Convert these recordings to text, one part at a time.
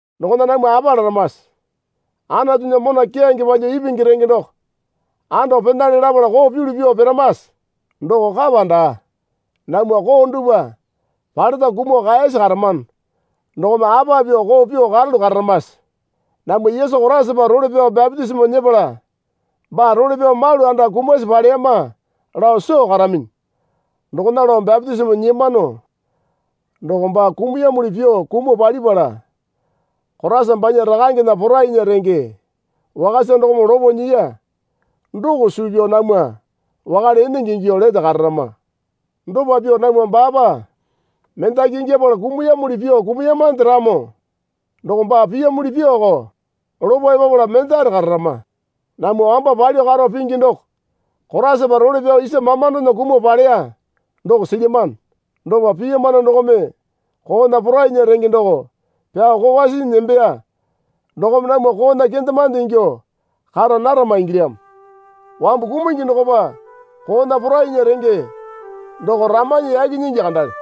Dokona namwa apa laramase? Anatunya mona keyange palyuo ipingi renge doko ando penale lapala koo pyulu pyuo piramase? Doko kapa daa. Namwa koo dupwa paleta kumuo kaeyasi karamano dokome apa pyuo koo pyuo karalu kararamase? Namwa Yesu Koraisapa role pyao bapitisimo nyepala baa role pyao malu anda kumasi paleyama lao soo karaminyi. Dokona lao bapitisimo nyiyamano doko baa kumuyamuli pyuo kumuo palipala Koraisa banya Rakangena porainya renge wakasa dokome lopo nyiya. Doko suu pyao namwa wakale enenge ingyuo lete kararama. Dopa pyao namwa baapa mendaki ingyapala kumuyamuli pyuo kumuyamande ramo doko baa piyamuli pyuoko lopo epapala mendare kararama. Namwa wamba palyuo karo pingi doko Koraisapa role pyao isa mamandona kumuo paleya doko silyamano. Dopa piyamano dokome koona porainya renge doko pyao kokwa sinyi nembeya dokome namwa koona kendemande ingyuo kara narama ingilyamo. Wambu kumungi dokopa koona porainya renge doko ramanyi yaki nyingi kandale.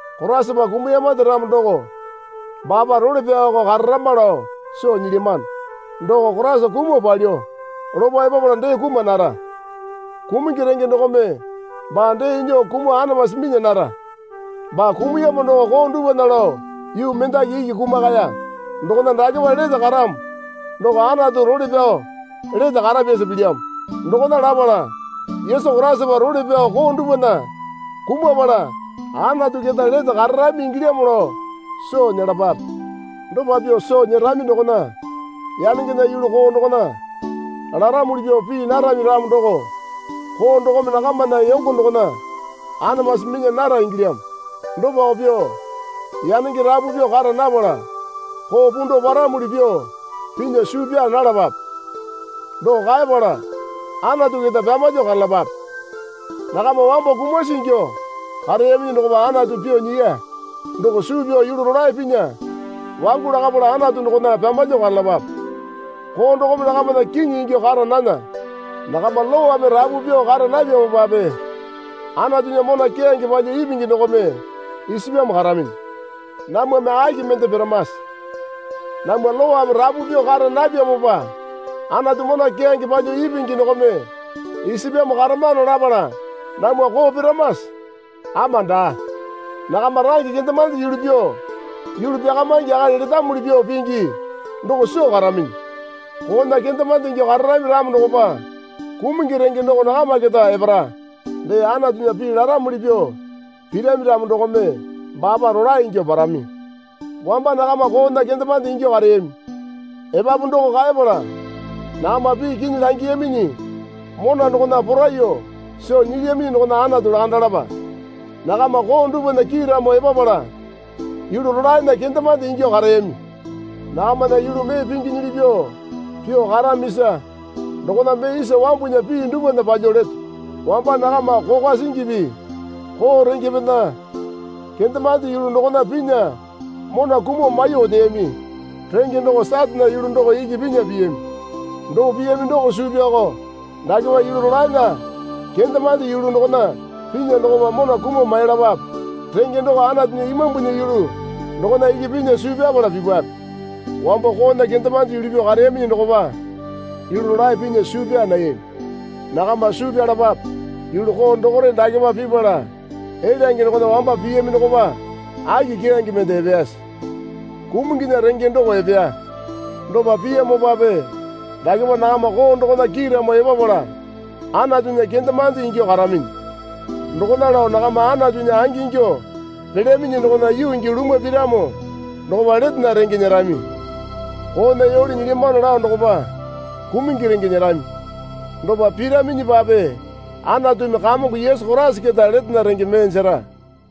Koraisapa kumuyamande ramo doko baapa role pyaoko kararama lao soo nyilyamano. Doko Koraisa kumuo palyuo lopo epapala dee kuma nara. Kumungi renge dokome baa dee nyuo kumuo anamasi minya nara. Baa kumuyamo doko koo dupwana lao yuu mendaki iki kumakaya. Dokona dakepa lete karamo doko Anatu role pyao lete karapyasa pilyamo. Dokona lapala Yesu Koraisapa role pyao koo dupwana kumapala Anatu keta lete kararami ingilyamo lao soo nyelapape. Dopa pyuo soo nyerami dokona yanengena yulu koo dokona laramuli pyuo pii narami ramo doko koo dokome nakamana yongo dokona anamasi minya nara ingilyamo. Dopako pyuo yanenge rapu pyuo kara napala koo pundao paramuli pyuo pinya suu pyaa nalapape. Doko kaepala Anatu keta pyamalyuo karalapape. Nakama wambo kumasi ingyuo kareyaminyi dokopa Anatu pyuo nyiya doko suu pyao yulu rolae pinya wangu lakapala Anatu dokona pyamalyuo karalapape. Koo dokome nakamana kiŋi ingyuo kara nana. Nakama lowame rapu pyuo kara napyamopape Anatunya mona keyange palyuo ipingi dokome isapyamo karaminyi. Namwame aki mende piramase? Namwa lowame rapu pyuo kara napyamopa Anatu mona keyange palyuo ipingi dokome isapyamo karamano lapala namwa koo piramase? Ama daa. Nakama range kendemande yulu pyuo yulu pyakamaingi akali letamuli pyuo pingi doko soo karaminyi. Koona kendemande ingyuo kararami ramo dokopa kumungi renge doko nakama keta epara. Dee Anatunya pii laramuli pyuo pirami ramo dokome baapa rolae ingyuo parami. Wamba nakama koona, kendemande ingyuo kareyami. Epapu doko kaepala, nakama pii kinyi langiyaminyi mona dokona poraiyuo soo nyilyaminyi dokona Anatu lakandalapa. Nakama koo dupwana kiiramo epapala yulu rolaena kendemande ingyuo kareyami. Nakamana yulu mee pinginyili pyuo pyuo karamisa dokona mee isa wambunya pii dupwana palyuo leto. Wamba nakama kokwa singipi koo rengepena kendemande yulu dokona pinya mona kumuo maiyuo oteyami. Renge doko Satane yulu doko iki pinya piyami. Doo piyami doko suu pyaoko dakepa yulu rolaena kendemande yulu dokona pinya dokopa mona kumuo mailapape. Renge doko Anatunya Imambunya yulu dokona iki pinya suu pyapala pipape. Wambo koona kendemande yulu pyuo kareyaminyi dokopa yulu rolae pinya suu pyaa nayami. Nakama suu pyalapape. Yulu koo dokore dakepa pipala elyange dokona wamba piyami dokopa aki keyange mende epeyase? Kumunginya renge doko epeya. Dopa piyamopape dakepa nakama koo dokona kiiramo epapala Anatunya kendemande ingyuo karaminyi. Dokona lao nakama Anatunya angingyuo pelyaminyi dokona yuu gii lumwa piramo dokopa letena renge nyerami. Koona yole nyilyamano lao dokopa kumungi renge nyerami. Dopa piraminyipape Anatumi Kamongo Yesu Koraisa keta letena renge mee jera.